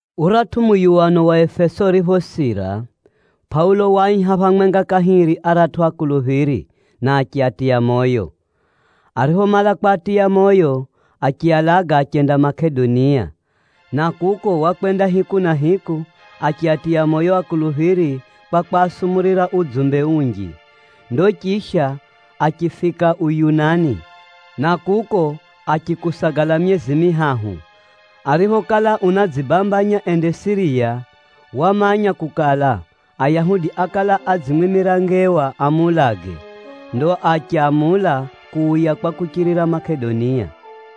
Uratʼu muyuwano wa Efeso uriphosira, Pʼaulo waaiha phamwenga kahiri aratʼu akuluphiri, na achiatiya moyo. Ariphomala kwatiya moyo, achialaga achenda Makedonia. Na kuko wakwenda hiku na hiku, achiatiya moyo akuluphiri kwa kwasumurira udzumbe unji. Ndo chisha achifika Uyunani, na kuko achikusagala myezi mihahu. Ariphokala unadzibambanya ende Siriya, wamanya kukala, Ayahudi ákala adzimwimira ngewa amuulage. Ndo achamula kuuya kwa kuchirira Makedonia.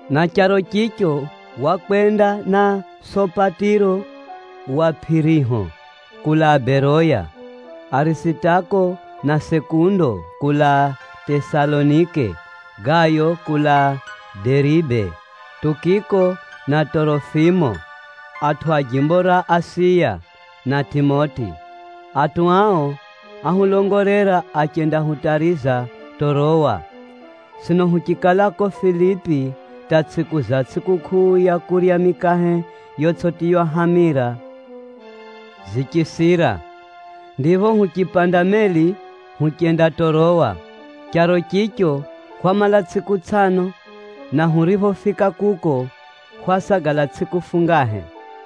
Na charo chicho, wakwenda na Sopatiro wa Pʼiriho kulaa Beroya, Arisitako na Sekundo kulaa Tesalonike, Gayo kulaa Deribe, Tukiko na Tʼorofimo, atʼu a jimbo ra Asiya, na Tʼimoti. Atʼu ao áhulongolera achendahutariza Tʼorowa. Sino huchikala ko Filipi hata tsʼiku za tsʼikukʼuu ya kurya mikahe yotsʼitiywa hamira zichisira, ndipho huchipanda meli huchenda Tʼorowa. Charo chicho hwamala tsʼiku tsʼano, na huriphofika kuko, hwasagala tsʼiku fungahe.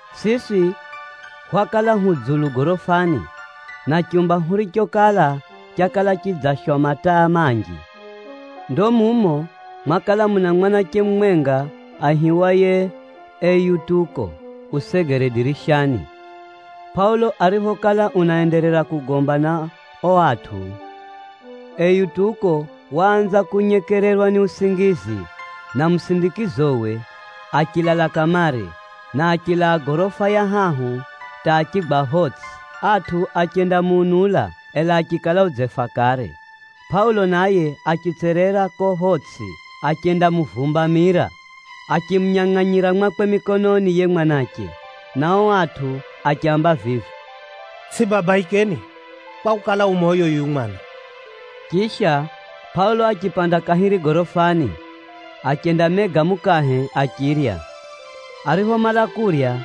Siswi hwakala hu dzulu gorofani, na chumba hurichokala, chakala chidzashwa mataa manji. Ndo mumo, mwakala muna mwanache mumwenga aihiwaye Eutuko usegere dirishani. Pʼaulo ariphokala unaenderera kugomba na o atʼu, Eutuko waanza kunyekererwa ni usingizi, na musindikizowe achilala kamare, na achilaa gorofa ya hahu hata achigwa photsʼi. Atʼu achendamuunula, ela achikala udzefa kare. Pʼaulo naye achitserera ko photsʼi, achendamuvumbamira achimunyangʼanyira mwakwe mikononi yiye mwanache, na o atʼu achiaamba vivi, “Tsʼibabaikeni, kwakukala, u moyo yuyu mwana!” Chisha, Pʼaulo achipanda kahiri gorofani, achendamega mukahe achirya. Ariphomala kurya,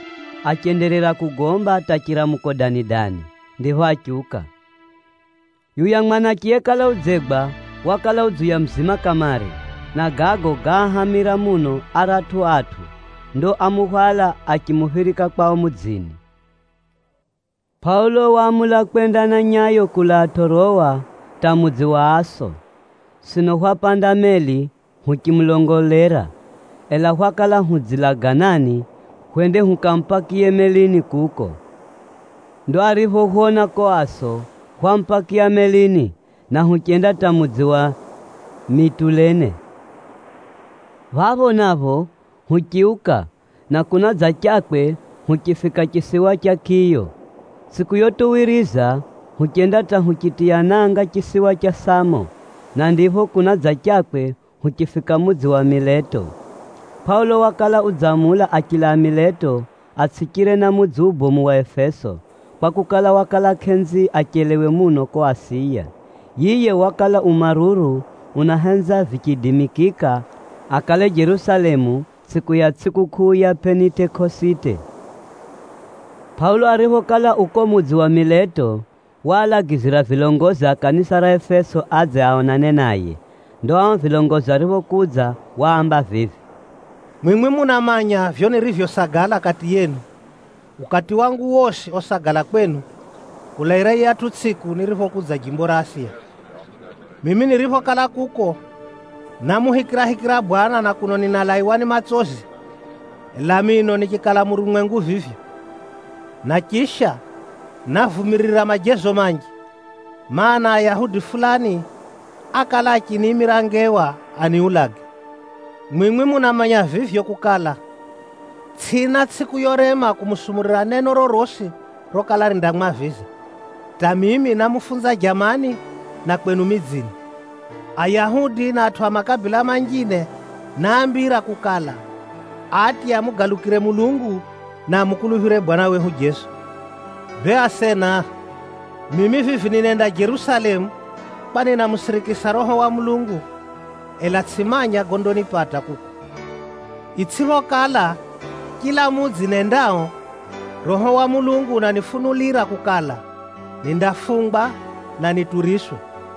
achenderera kugomba hata chiramuko dani-dani, ndipho achiuka. Yuya mwanache yekala udzegwa, wakala udziuya muzima kamare, na gago gáahamira muno aratʼu atʼu. Ndo ámuhwala, achimuphirika kwao mudzini. Pʼaulo waamula kwenda na nyayo kulaa Tʼorowa hata mudzi wa Aso. Sino hwapanda meli huchimulongolera, ela hwakala hudzilaganani, hwende hukamupakiye melini kuko. Ndo ariphohwona ko Aso, hwamupakiya melini, na huchenda hata mudzi wa Mitulene. Phapho napho huchiuka, na kunadzachakwe huchifika chisiwa cha Kiyo. Tsʼiku yotuwiriza, huchenda hata huchitiya nanga chisiwa cha Samo, na ndipho kunadzachakwe huchifika mudzi wa Mileto. Pʼaulo wakala udzamula achilaa Mileto, atsʼichire na mudzi ubomu wa Efeso, kwakukala, wakala kʼenzi achelewe muno ko Asiya. Yiye wakala u maruru unahenza vichiidimikika akale Jerusalemu tsʼiku ya tsʼikukʼuu ya Pʼenitekosite. Pʼaulo ariphokala u ko mudzi wa Mileto, waalagizira vilongozi a kanisa ra Efeso adze aonane naye. Ndo ao vilongozi ariphokudza, waamba vivi, “Mwimwi munamanya vivyo nirivyosagala kati yenu, ukati wangu wosi osagala kwenu, kulaira yiyatʼu tsʼiku niriphokudza jimbo ra Asiya. Mimi niriphokala kuko, námuhikirahikira Bwana na kuno ninalaiwa ni matsozi, ela mino nichikala murumwengu vivyo. Na chisha, návumirira majezo manji, mana, Ayahudi fulani ákala achiniimira ngewa aniulage. Mwimwi munamanya vivyo kukala, tsʼina tsʼiku yorema kumusumurira neno rorosi rokala rindamwaviza, hata mimi námufunza jamani, na kwenu midzini. Ayahudi na atʼu a makabila manjine náambira kukala, atye amugalukire Mulungu, na amukuluphire Bwana wehu Jeso. Bee asena, mimi vivi ninenda Jerusalemu kwa ninamusirikisa Roho wa Mulungu, ela tsʼimanya gondanipata kuko. Itsʼiphokala, chila mudzi nendao, Roho wa Mulungu unanifunulira kukala, nindafungwa, na nituriswe.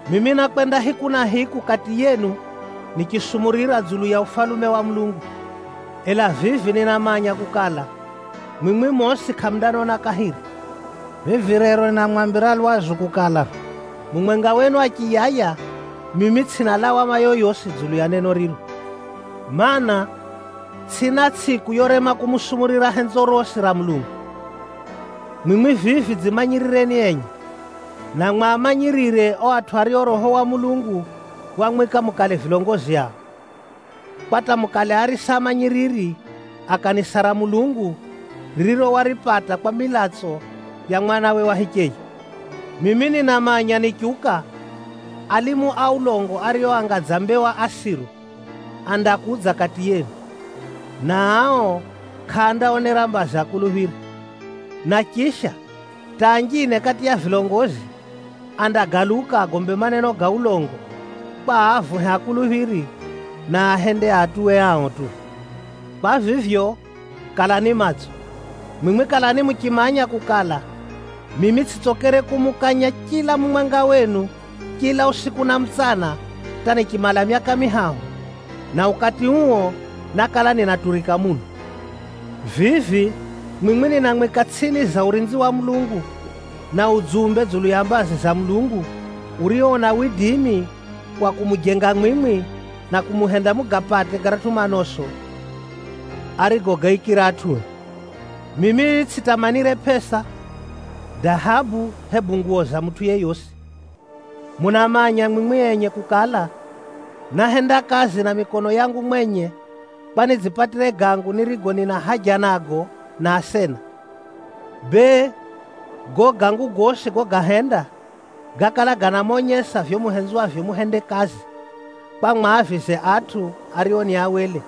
“Mimi nákwenda hiku na hiku kati yenu nichisumurira dzulu ya Ufalume wa Mulungu. Ela vivi ninamanya kukala, mwimwi mosi kʼamundanona kahiri. Vivi rero ninamwambira lwazu kukala, mumwenga wenu achiyaya, mimi tsʼina lawama yoyosi dzulu ya neno riro, mana, tsʼina tsʼiku yorema kumusumurira henzo rosi ra Mulungu. Mwimwi vivi dzimanyirireni enye, na mwamanyirire o atʼu ario Roho wa Mulungu wamwika mukale vilongozi ao, kwa hata mukale arisa amanyiriri, a kanisa ra Mulungu, ririro waripata kwa milatso ya Mwanawe wa hicheye. Mimi ninamanya nichiuka, alimu a ulongo ario anga dza mbewa asiru, andakudza kati yenu, na ao kʼaandaonera mbazi akuluphiri. Na chisha, hata anjine kati ya vilongozi, andagaluka agombe maneno ga ulongo, kwa aavuhe akuluphiri, na aahende aatuwe ao tu. Kwa vivyo, kalani matso! Mwimwi kalani muchimanya kukala, mimi tsʼitsokere kumukanya chila mumwenga wenu chila usiku na mutsana hata nichimala myaka mihahu, na ukati uo nákala ninaturika muno. “Vivi mwimwi ninamwika tsʼini za urinzi wa Mulungu, na udzumbe dzulu ya mbazi za Mulungu, urio una widimi wa kumujenga mwimwi, na kumuhenda mugapate garatʼu manoso arigogaikira atʼue. Mimi tsʼitamanire pʼesa, dahabu hebu nguwo za mutʼu yeyosi. Munamanya mwimwi enye kukala, náhenda kazi na mikono yangu mwenye, kwa nidzipatire gangu nirigo nina haja nago na asena. Bee gago gangu gosi gogahenda, gákala ganamonyesa vivyo muhenzwavyo muhende kazi, kwa mwaavize atʼu ario ni awele.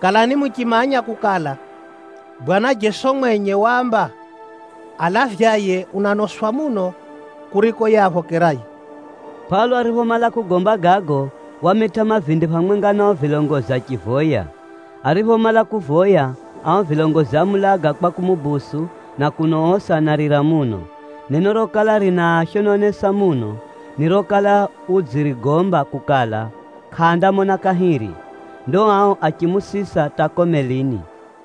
Kalani muchimanya kukala, Bwana Jeso mwenye waamba, ‘Alavyaye unanoswa muno kuriko yiye aphokeraye.’” Pʼaulo ariphomala kugomba gago, wamitʼa mavindi phamwenga na o vilongozi achivoya. Ariphomala kuvoya, ao vilongozi ámuulaga kwa kumubusu na kuno osi anarira muno. Neno rokala rinaashononesa muno, ni rokala udzirigomba kukala, kʼaandamona kahiri. Ndo ao achimusisa hata ko melini.